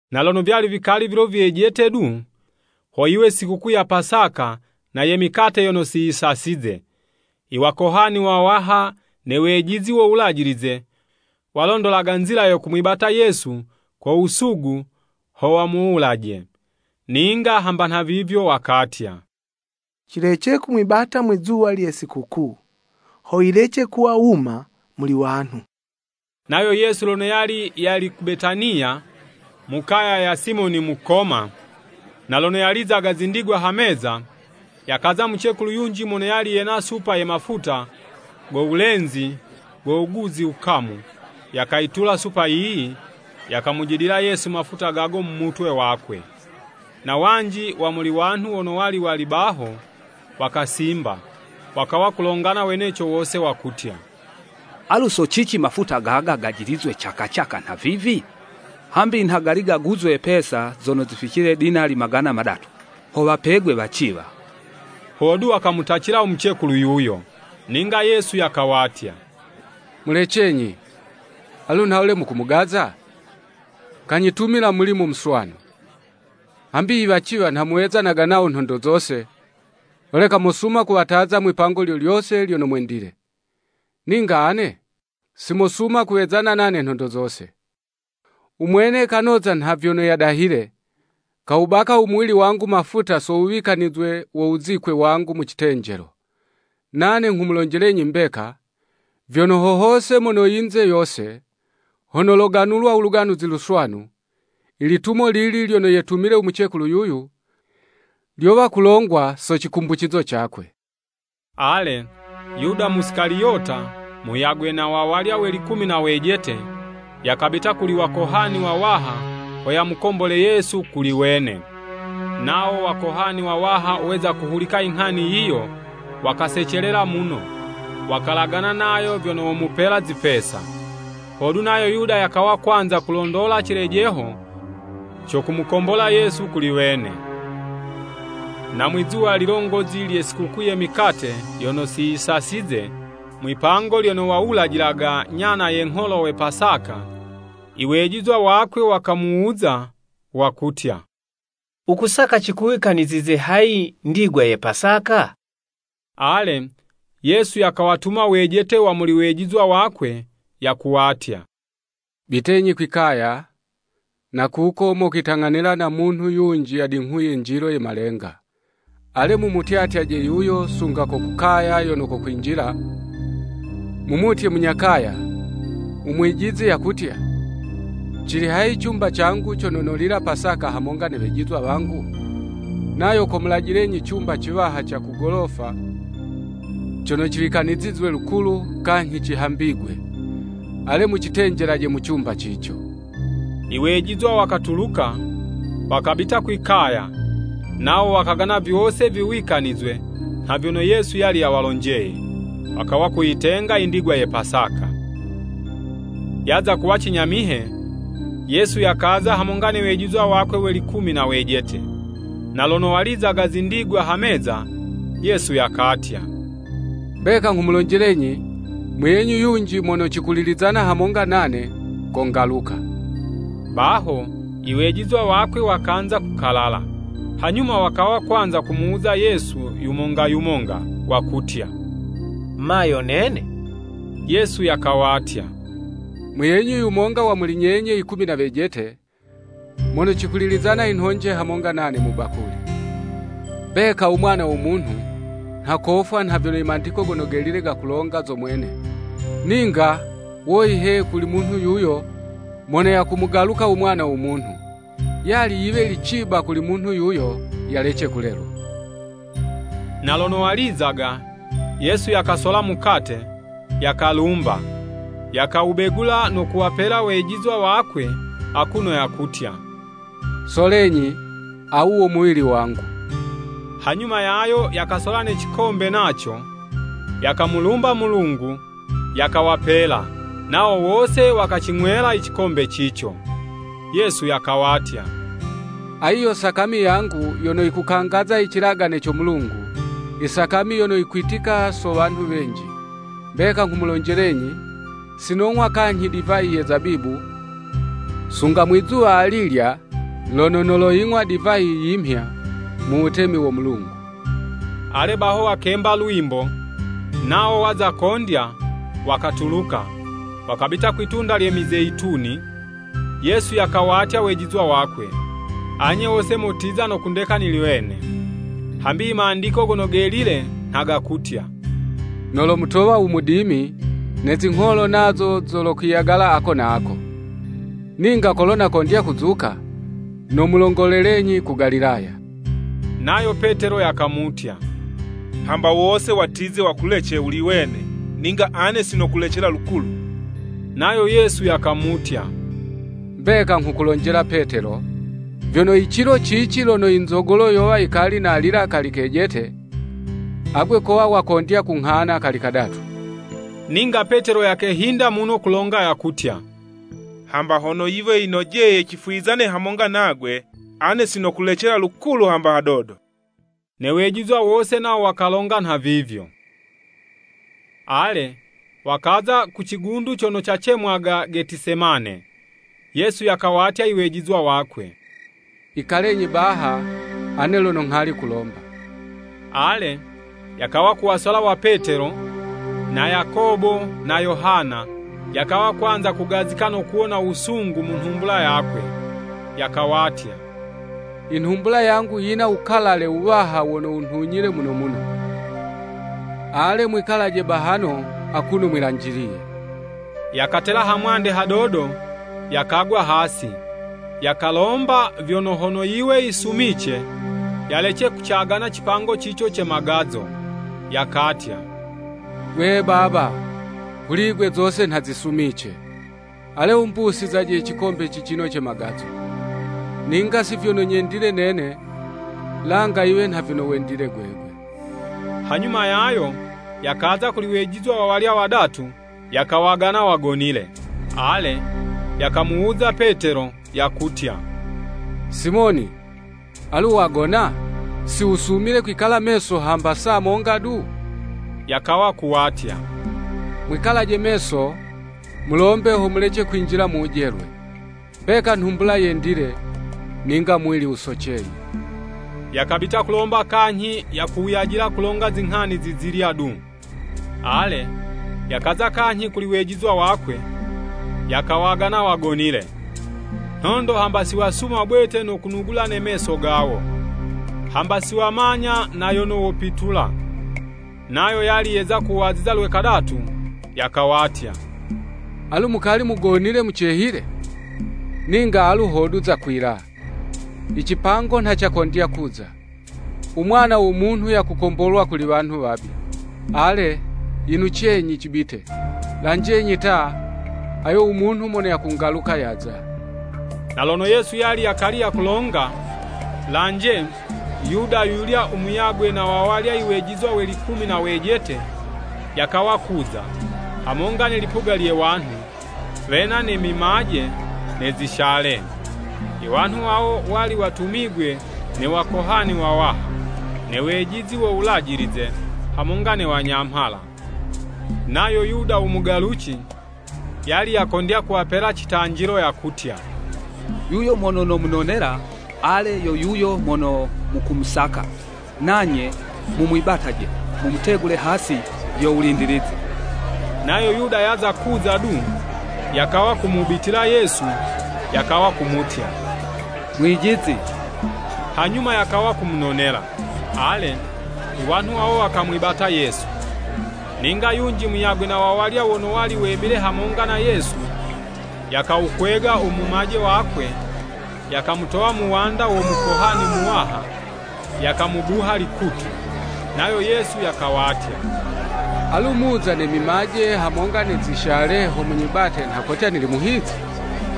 Na lono vyali vikali vilo vyejete du, ho yiwe sikukuu ya Pasaka na ye mikate yono siyisasize. Iwakohani wawaha ne wejizi wo Wulajilize, walondolaga nzila yo kumwibata Yesu ko wusugu ho wamuwulaje. Ninga hamba nhavivyo wakatya, “Cilece kumwibata mwizuwa lye sikukuu, ho yilece kuwa wuma muli wanhu.” Nayo Yesu lono yali yali ku Betaniya, mu kaya ya Simoni Mukoma. Na lono yalizaga zindigwa ha meza, yakaza mucekulu yunji mono yali yena supa ye mafuta go wulenzi go wuguzi wukamu, yakayitula supa yiyi, yakamujidila Yesu mafuta gago mu mutwe wakwe. Na wanji wa muli wanhu wono wali wali baho, wakasimba wakawa kulongana weneco wose wakutya, “Alu so cici mafuta gaga gajilizwe caka caka nha vivi? Hambi nha gali gaguzwe pesa zono zificile dinali magana madatu, ho wapegwe waciwa!” Hodu wakamutacila u mucekulu yuyo. Ninga Yesu yakawatya, “Mulecenyi, alu nhawule mukumugaza? Kanyitumila mulimo muswanu. Hambi iwaciwa nha muwezanaga nawo nhondo zose, holeka mosuma kuwataza mwipango lyo lyose lyono mwendile. Ninga ane, si mosuma kuwezana nane nhondo zose. U Mwene kanoza nha vyono yadahile, kawubaka umuwili wangu mafuta so wuwikanizwe wo wuzikwe wangu mu citenjelo. Nane nghumulonjelenyi mbeka, vyono, ho hose mono yinze yose, hono loganulwa u Luganuzi Luswanu, ilitumo lili lyono yetumile u mucekulu yuyu, lyowa kulongwa so cikumbucizo cakwe.” Ale, Yuda Musikaliyota, muyagwe na wawalya we likumi na wejete, yakabita kuli wakohani wawaha ho yamukombole Yesu kuli wene. Nawo Wakohani wawaha weza kuhulika inghani yiyo, wakasecelela muno, wakalagana nayo vyono womupela zipesa. Hodu nayo Yuda yakawa kwanza kulondola cilejeho co kumukombola Yesu kuli wene. Na mwizuwa lilongozi lye sikukuu ye mikate yono siyisasize, mwipango lyono wawulajilaga nyana ye ngholo we Pasaka, iwejizwa wakwe wakamuwuza, wakutya, “Wukusaka cikuwikanizize hayi ndigwa ye Pasaka?” Ale, Yesu yakawatuma wejete wa muli wejizwa wakwe yakuwatya, “Bitenyi kwi'kaya, na kuko mokwitang'anila na munhu yunji yadinghuye njilo ye malenga. Ale, mumutyatyaje yuyo, sunga ko ku kaya yono kokwinjila, mumutye munya kaya, ‘Umwijizi yakutya, cili hayi cumba cangu cono nolila Pasaka hamonga ne wejizwa wangu?’ Nayo komulajilenyi cumba ciwaha ca ku golofa cono ciwikanizizwe lukulu, kanyhi cihambigwe. Ale mucitenjelaje mu cumba cico.” Iwejizwa wakatuluka, wakabita kwi'kaya, nawo wakagana vyose viwikanizwe nha vyono Yesu yali yawalonjeye. Wakawa kuyitenga i ndigwa ye Pasaka. Yaza kuwa cinyamihe. Yesu yakaza hamonga ne wejizwa wakwe we likumi na wejete. Na lono walizaga zindigwa ha meza, Yesu yakatya, “Mbeka nghumulonjelenyi, muyenyu yunji mono cikulizana hamonga nane, kongaluka.” Baho iwejizwa wakwe wakanza kukalala, hanyuma wakawa kwanza kumuwuza Yesu yumonga yumonga, wakutya, “Ma yo nene?” Yesu yakawatya, “Muyenyu yumonga wa muli nyenye yikumi na wejete, mono cikulilizana i nhonje hamonga nane mu bakuli. Mbeka u Mwana wo Munhu nha kofwa nha vyono i Mandiko Gono Gelile gakulonga zo mwene, ninga, woyi he, kuli munhu yuyo mono yakumugaluka Mwana wo Munhu! Yali yiwe yili ciba kuli munhu yuyo, yalece kulelwa!” Na lono walizaga, Yesu yakasola mukate, yakalumba, yakawubegula no kuwapela wejizwa wakwe akuno yakutya, “Solenyi awu wo muwili wangu.” Hanyuma yayo yakasola ne cikombe naco, yakamulumba Mulungu, yakawapela, nawo wose wakacing'wela i cikombe cico. Yesu yakawatya, “Ayi yo sakami yangu yono yikukangaza i cilagane co Mulungu, isakami yono yikwitika so wanhu wenji. Mbeka nghumulonjelenyi, sinong'wa kanyhi divayi ye zabibu, sunga mwizuwa alilya lono noloying'wa divayi yimhya, mu wutemi wo Mulungu.” Ale baho wakemba lwimbo, nawo waza kondya, wakatuluka, wakabita kwi'tunda lye Mizeyituni. Yesu yakawatya wejizwa wakwe, Anye wose motiza no kundeka nili wene, hambi i Mandiko Gono Gelile nha gakutya, “Nolomutowa u mudimi, ne zingholo nazo zolokwiyagala ako na ako.” Ninga kolo nakondya kuzuka, nomulongolelenyi ku Galilaya. Nayo Petelo yakamutya, “Hamba wose watize wakulece wuli wene, ninga ane si nokulecela lukulu!” Nayo Yesu yakamutya, “Mbeka nghukulonjela Petelo, vyono i cilo cici lono i nzogolo yowa yikali nalila kali kejete, agwe kowa wakondya kunghana kali kadatu.” Ninga Petelo yakehinda muno kulonga yakutya, “Hamba hono yiwe yinojeye cifwizane hamonga nagwe, ane sinokulecela lukulu hamba hadodo.” Ne wejizwa wose nawo wakalonga nhavivyo. Ale, wakaza ku cigundu cono cacemwaga Getisemane. Yesu yakawatya iwejizwa wakwe, “Ikalenyi baha, ane lono nghali kulomba.” Ale, yakawa kuwasola wa Petelo, na Yakobo na Yohana, yakawa kwanza kugazika no kuwona wusungu mu nhumbula yakwe. Yakawatya, “I nhumbula yangu yina wukalale wuwaha wono wunhuliye muno muno. Ale, mwikalaje bahano akuno mwilanjiliye.” Yakatela ha mwande hadodo, yakagwa hasi, yakalomba vyono, hono yiwe yisumice, yalece kucagana cipango cico ce magazo. Yakatya, “Gwe Baba, kuli'gwe zose nha zisumice. Ale wumbusizaje icikombe cicino ce magazo. Ninga si vyono nyendile nene, langa yiwe nha vyono wendile gwegwe.” Hanyuma yayo, yakaza kuli wejizwa wawalya wadatu, yakawagana wagonile. Ale, yakamuwuza Petelo, yakutya, “Simoni, alu, wagona? Si wusumile kwikala meso hamba saa monga du? Yakawa kuwatya, mwikalaje meso, mulombe ho mulece kwinjila mu wujelwe. Mbeka nhumbula yendile, ninga muwili wusoceye.” Yakabita kulomba kanyhi yakuwuyajila kulonga zinghani zizilya du. Ale, yakaza kanyhi kuli wejizwa wakwe, yakawagana wagonile. Nhondo hamba si wasuma bwete no kunugula ne meso gawo. Hamba siwamanya na yono wopitula. Nayo yali yeza kuwaziza lwe kadatu yakawatya, “Alu mukali mugonile mucehile? Ninga alu hodu zakwila! Icipango nha cakondya kuza! U Mwana wo Munhu yakukombolwa kuli wanhu wabi. Ale, yinucenyi, cibite. Lanjenyi ta, ayo u munhu mono yakungaluka yaza!” Na lono Yesu yali yakali yakulonga, lanje, Yuda yuyulya u muyagwe na wawalya iwejizwa we likumi na wejete, yakawa kuza, hamonga ne lipuga lye wanhu, wena ne mimaje ne zishale. Iwanhu wawo wali watumigwe ne Wakohani wawaha, ne wejizi wo Wulajilize hamonga ne Wanyamhala. Nayo Yuda u mugaluci, yali yakondya kuwapela citanjilo yakutya, “Yuyo mono nomunonela, ale, yo yuyo mono mukumusaka, nanye mumwibataje mumutegule hasi yo wulindilizi.” Nayo Yuda yaza kuza du, yakawa kumubitila Yesu, yakawa kumutya, “Mwijizi!” Hanyuma yakawa kumunonela. Ale, iwanhu wawo wakamwibata Yesu. Ninga yunji muyagwe na wawalya wono wali wemile hamonga na Yesu, yakawukwega u mumaje wakwe, yakamutowa muwanda wo Mukuhani muwaha, yakamubuha likutu. Nayo Yesu yakawatya, “Alu muza mwina ne mimaje hamonga ne zishale ho munyibate nha kotya nili muhizi?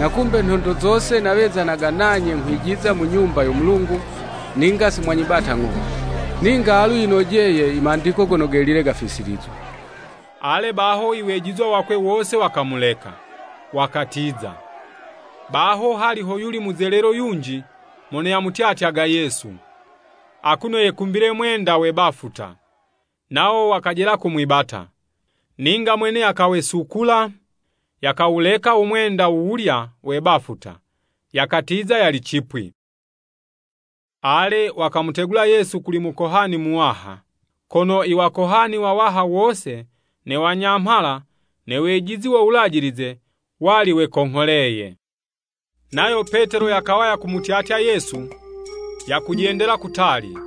Na kumbe nhondo zose nawezanaga nanye nghwijiza mu Nyumba yo Mulungu, ninga simwanyibata ng'o. Ninga alu yinojeye i Mandiko Gono Gelile gafisilizwe.” Ale baho iwejizwa wakwe wose wakamuleka, wakatiza. Baho hali hoyuli muzelelo yunji mono yamutyatyaga Yesu, akuno yekumbile mwenda we bafuta. Nawo wakajela kumwibata. Ninga mwene yakawesukula, yakawuleka u mwenda wuwulya we bafuta, yakatiza yali cipwi. Ale, wakamutegula Yesu kuli Mukohani Muwaha, kono Iwakohani wawaha wose, ne wanyamhala ne wejizi wo wulajilize wali wekongholeye. Nayo Petelo yakawa yakumutyatya Yesu, yakujendela kutali,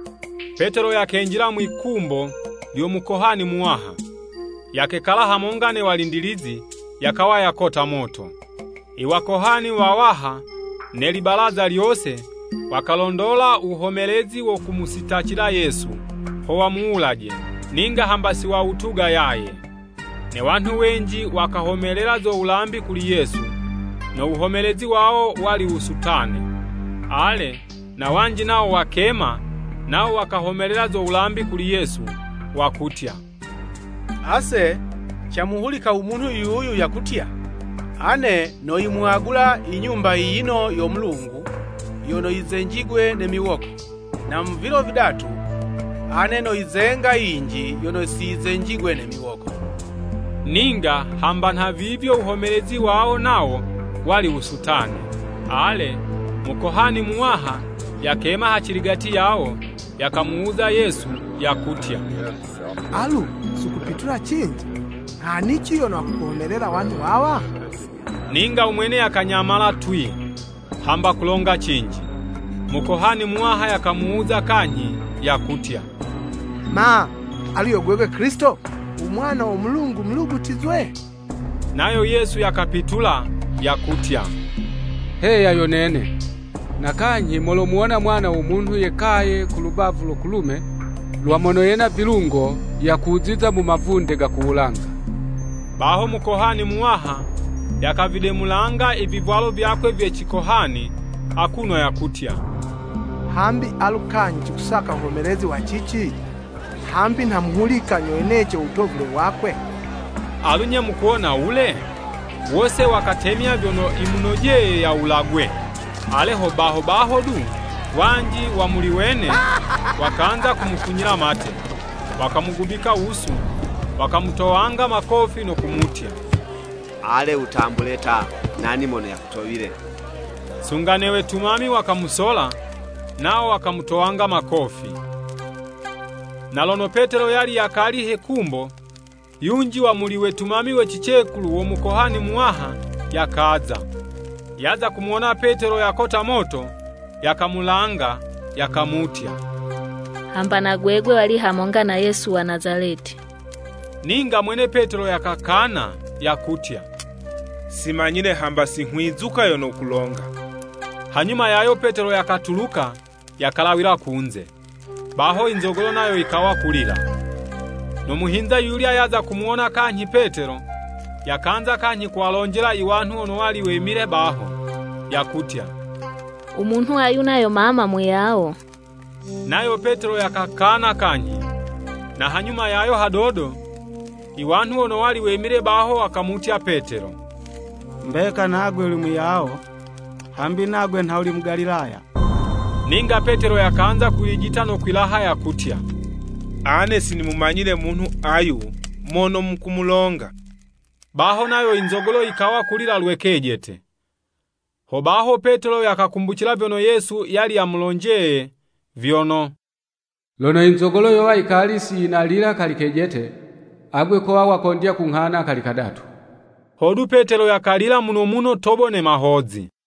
Petelo yakenjila mwi'kumbo lyo Mukohani Muwaha, yakekala hamonga ne walindilizi, yakawa yakota moto. Iwakohani wawaha ne Libalaza lyose, wakalondola wuhomelezi wo kumusitacila Yesu ho wamuwulaje, ninga hamba si wawutuga yaye. Ne wanhu wenji wakahomelela zo wulambi kuli Yesu, no wuhomelezi wawo wali wusutane. Ale, na wanji nawo wakema, nawo wakahomelela zo wulambi kuli Yesu, wakutya, “Ase camuhulika umunhu yuyu yakutya, Ane noyimwagula i Nyumba yiyino yo Mulungu yono yizenjigwe ne miwoko, na mu vilo vidatu, ane noyizenga yinji yono siyizenjigwe ne miwoko.” Ninga, hamba nhavivyo, u wuhomelezi wawo nawo, wali wusutane. Ale, Mukohani Muwaha yakema haciligati yawo, yakamuwuza Yesu, yakutya, “Alu, siwukupitula cinji? Nghanici yono wakukuhomelela i wanhu wawa?” Ninga u mwene yakanyamala twii, hamba kulonga cinji. Mukohani Muwaha yakamuwuza kanyhi yakutya, “Ma, alu yo gwegwe Kilisito. U mwana wo Mulungu Mulugutizwe?” Nayo Yesu yakapitula, yakutya, “Heya yo nene. Na kanyhi, molomuwona u Mwana wo Munhu yekaye ku lubavu lo kulume lwa Mono yena Vilungo, yakuziza mu mavunde ga ku wulanga.” Baho Mukohani Muwaha yakavidemulanga i vivwalo vyakwe vye cikohani, akuno yakutya, “Hambi alu kanyhi cikusaka wuhomelezi wa cici? Hambi nha muwuhulika nyo weneco u wotovule wakwe!” Alu 'nye mukuwona wule? Wose wakatemya vyono yimunojeye yawulagwe. Ale ho baho baho du, wanji wa muli wene, wakanza kumufunyila mate, wakamugubika wusu, wakamutowanga makofi no kumutya, “Ale wutambule ta, nani mono yakutowile!” Sunga ne wetumami wakamusola, nawo wakamutowanga makofi. Na lono Petelo yali yakali he kumbo, yunji wa muli wetumami we cicekulu wo Mukohani Muwaha yakaza. Yaza kumuwona Petelo yakota moto, yakamulanga, yakamutya, “Hamba na gwegwe wali hamonga na Yesu wa Nazaleti.” Ninga mwene Petelo yakakana, yakutya, “Si manyile hamba singhwizuka yono wukulonga!” Hanyuma yayo Petelo yakatuluka yakalawila kunze. Baho inzogolo nayo yikawa kulila. No muhinza yuyulya yaza kumuwona kanyhi Petelo, yakanza kanyhi kuwalonjela i wanhu wono wali wemile baho, yakutya, “U Munhu ayu nayo mama, muyawo.” Nayo Petelo yakakana kanyhi. Na hanyuma yayo hadodo, iwanhu wono wali wemile baho wakamutya Petelo, “Mbeka nagwe uli muyawo, hambi nagwe ha wuli Mugalilaya.” Ninga Petelo yakanza kwilijita no kwilaha yakutya, “Ane si nimumanyile munhu ayu mono mukumulonga.” Baho nayo inzogolo yikawa kulila lwe kejete. Hobaho Petelo yakakumbucila vyono Yesu yali yamulonjeye, vyono “Lono inzogolo yowa yikali siyinalila kali kejete, agwe kowa wakondya kunghana kali kadatu.” Hodu Petelo yakalila muno muno tobo ne mahozi.